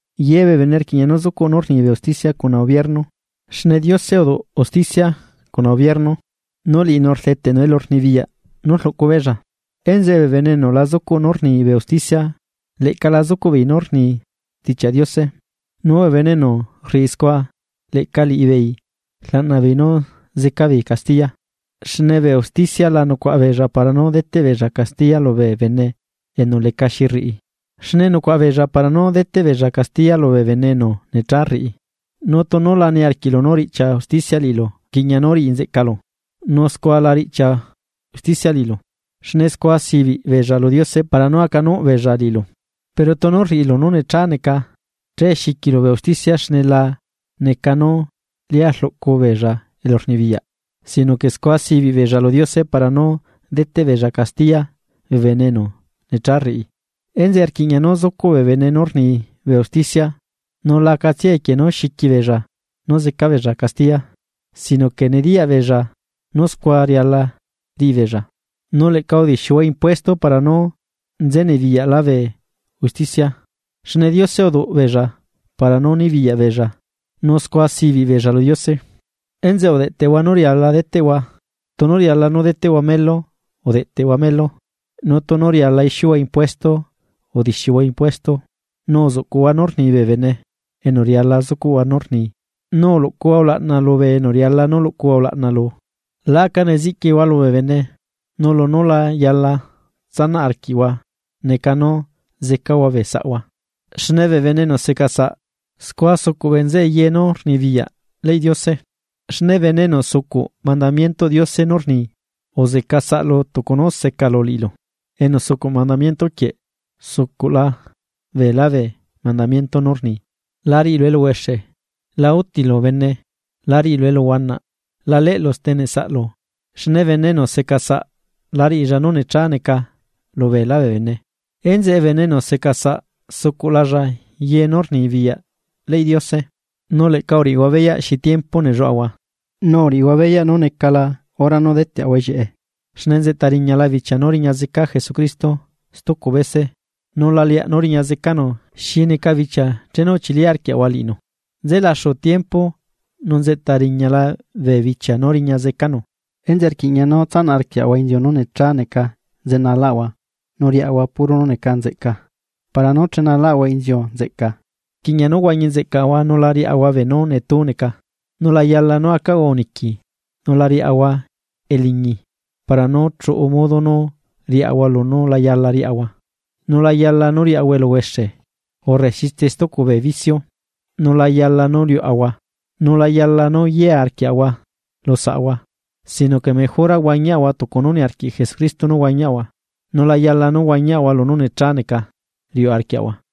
Yebee bene rquiꞌña nú zucuꞌ nú rnibee usticia cuna ubierno. Xne Diose uduꞌ bee usticia cuna ubierno, nu liꞌinu rdeteꞌnu elurnibiyaꞌ nú rluꞌcubeella. Enzeꞌe bee bene enu la zucuꞌ nú rni bee usticia leꞌca la zucuꞌbeei nú rni Stichiaꞌ Diose nu bee bene enu rriꞌi scua leꞌca liꞌibeei rlaꞌna beei nú zeca beei castiya. Xne bee usticia la nucuaꞌa beella para nú deteꞌ beella castiya lubee bene enu lecaxi riꞌi, xne nucuaꞌa beella para nú deteꞌ beella castiya lubee bene enu necha rriꞌi, nu tunu la niarquiꞌlu nú riꞌchia usticia liꞌilu rquiꞌña nú riꞌi nzeꞌcalu, nu scua la riꞌchia usticia liꞌilu. Xne scua sibiꞌ beella lu Diose para nú acanuꞌbeella liꞌilu. Pero tunu rriꞌilu nú necha neca, che xiquilu bee usticia xne la neca nú lia rluꞌcu beella elurnibiyaꞌ sino que scua sibiꞌ beella lu Diose para nú deteꞌ beella castiya bee bene enu necha rriꞌi. Enzeꞌe rquiꞌña nú zucuꞌ bee bene nú rni bee usticia nu la acatsiae equie nú xiquibeella nú zeca beella castiya, sino que nediyaꞌ beella nú scua riala riꞌibeella. Nu leꞌca udixiuhua impuesto para nú nzenibiyaꞌla bee usticia, xne Diose uduꞌ liꞌibeella para nú nibiyaꞌ beella nu scua sibiꞌ beella lu Diose. Enzeꞌe udeꞌteꞌhua nú riala deteꞌhua, tunu riala nú deteꞌhua melu, udeꞌteꞌhua melu, nu tunu riala ixiuhua impuesto, udixiuhua impuesto. Nu uzuꞌcuꞌhua nú rni bee bene enu riala zucuꞌhua nú rni, nu uluꞌcuhua ulaꞌna lubee enu riala nú luꞌcuhua ulaꞌna lu. La aca neziꞌquihua lubee bene, nu lunú la yala tsanaꞌ arquiꞌhua neca nú zecahua bee saꞌhua. Xne bee bene enu secasaꞌ, scua sucuꞌ bee nzeꞌe ye nú rnibiyaꞌ leyꞌ Diose. Xne bene enu sucuꞌ mandamientoꞌ Diose nú rni: “Uzeca saꞌlu tucu nú secalu liꞌilu.” Enu sucuꞌ mandamiento quieꞌ, sucuꞌla beelá bee mandamiento nú rni: “La riꞌilu eluhuexe, la utilu bene, la riꞌilu eluhuanaꞌ, la leꞌlu steneꞌ saꞌlu.” Xne bene enu seca saꞌ la riꞌilla nú necha neca lubeelá bee bene, enzeꞌe bene enu seca saꞌ sucuꞌlalla ye nú rnibiyaꞌ leyꞌ Diose. Nu leꞌca uriꞌihua beyaꞌ xi tiempo nelluaꞌahua, nu uriꞌihua beyaꞌ nú necala hora nú deteꞌahua ellieꞌe. Xne nzeꞌta riñala bichia nú riña zeca Jesucristo stucu bese nu la leaꞌ nú riña zecanu xi neca bichia chenu uchili arquiaꞌahua liꞌinu. Nze laxu tiempo, nu nzeꞌta riñala bee bichia nú riña zecanu, enzeꞌe rquiꞌña nú tsanaꞌ arquiaꞌahua inziu nú necha neca nzenalaꞌahua nu riaꞌahua puro nú neca nzeꞌca para nú chenalaꞌahua inziu nzeꞌca. Rquiꞌña nú huañi nzeꞌcaꞌahua, nu la riaꞌahua beenú netú neca. Nu la yala nú acaꞌahua uniqui nu la riaꞌahua eliñi para nú chuꞌu modo nú riaꞌahua lunú la yala riaꞌahua. Nu la yala nú riaꞌahua eluhuexe urre xitse stucu bee vicio, nu la yala nú liuꞌahua, nu la yala nú yea arquiaꞌahua lu saꞌahua. Sino que mejora uhuañihua tucu nú niarquiꞌ Jesucristo nú huañihua, nu la yala nú huañihua lunú necha neca riuꞌ arquiꞌhua.